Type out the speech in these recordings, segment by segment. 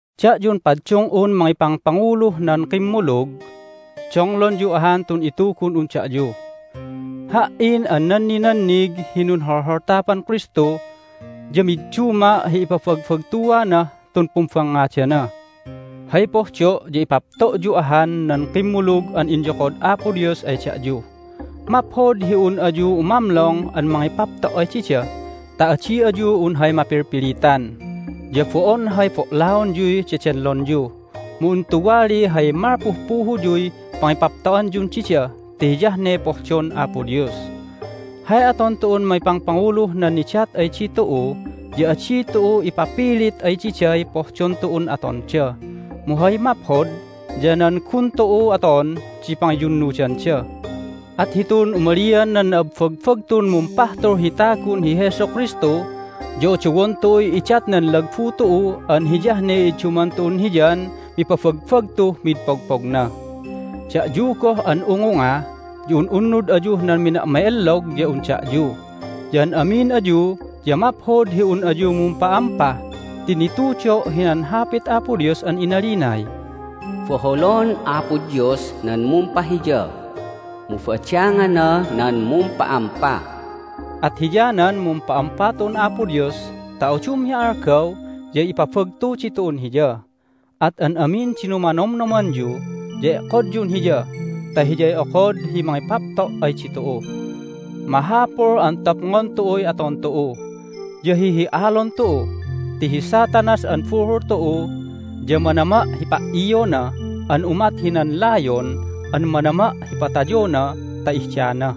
Da'yun paddung'un mangipangpanguluh nan kimmulug, donglonyu ahan tun itugun'un da'yu. Ha"in an nanninannig hi nunholholtapan Kristu ya midduma' hi ipabagbagtuanah tun pumbangngadana. Hay pohdo' ya ipapto'yu ahan nan kimmulug an inyokod Apo Dios ay da'yu. Maphod hi un ayu umamlong an mangipapto' ay dida ta adi ayu un hay mapilpilitan, ya bo'on hay bo'laonyuy dedenlonyu, mu un tuwaliy hay malpuh puhuyuy pangipapto'anyun dida ti hiyah ne pohdon Apo Dios. Hay aton tu'un mangipangpanguluh nan nidat ay ditu'u ya adi tu'u ipapilit ay diday pohdon tu'un atonda, mu hay maphod ya nan gun tu'u aton di pangiyunnudanda. At hitun umalian nan na'abbagbagtun Mumpahtul hi tagun hi Jesu Kristu ya odowon tu'uy idatnan lagbu tu'u an hiyah ne idduman tu'un Hiyan mipabagbagtuh mid pogpogna. Da'yu goh an ungunga ya un'unnud ayuh nan mina'ma'ellog ya un da'yu. Ya an amin ayu ya maphod hi un ayu mumpa'ampa ti nitudo' hinan Hapit Apo Dios an inalinay, "Boholon Apo Dios nan mumpahiya, mu badangana nan mumpa'ampa." At hiyanan mumpa'ampa tu'un Apo Dios ta udum hi algaw ya ipabagtu ditu'un Hiya. At an amin di numanomnomanyu ya e'kodyun Hiya ta Hiyay okod hi mangipapto' ay ditu'u. Mahapul an topngon tu'uy aton tu'u, ya hihi'alon tu'u! Ti hi Satanas an buhul tu'u ya manama' hi pa"iona an umat hinan layon an manama' hi patayona ta ihdana.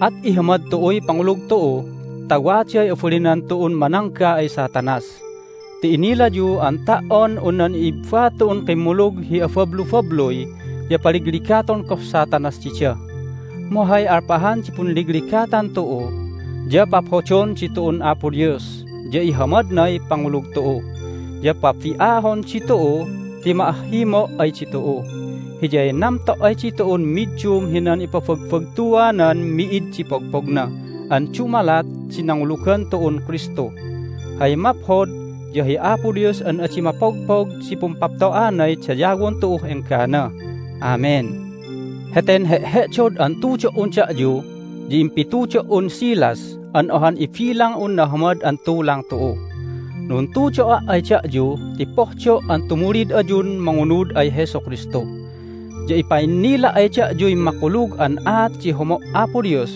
At ihamad tu'uy pangulug tu'u ta waday abalinan tu'un manangga ay Satanas. Ti inilayu an ta"on un nan i'ibba tu'un kimmulug hi abablubabluy ya paligligaton goh Satanas dida. Mu hay alpahan di punligligatan tu'u ya paphodon ditu'un Apo Dios, ya ihamadnay pangulug tu'u, ya pabi'ahon ditu'u ti ma'ahhimo' ay ditu'u. Hiyay namto' ay ditu'un middum hinan ipabagbagtuanan mi'id di pogpogna an dumalat di nangulugan tu'un Kristu. Hay maphod ya hi Apo Dios an adi mapogpog di pumpapto'anay dayawon tu'uh enggana! Amen. Heten he'he'dod an tudo"un da'yu ya impitudo"un Silas an ohan ibilang'un nahamad an tulang tu'u. Nuntudo'a' ay da'yu ti pohdo' an tumulid ayun mangunud ay Jesu Kristu, ya ipa'innila' ay da'yuy makulug an aat di homo' Apo Dios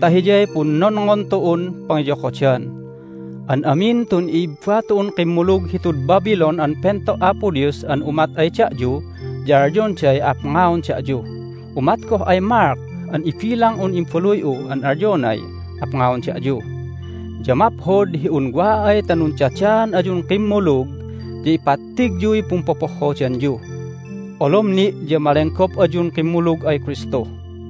ta hiyay punnonngon tu'un pangiyokodan. An amin tun i'ibba tu'un kimmulug hitud Babylon an pento' Apo Dios an umat ay da'yu ya alyonday apngaon da'yu. Umat goh ay Mark an ibilang'un imbaluy'u an alyonay apngaon da'yu. Ya maphod hi un wa ay ta nundadaan ayun kimmulug ya ipattigyuy pumpopohhodanyu. Olom ni' ya malenggop ayun kimmulug ay Kristu!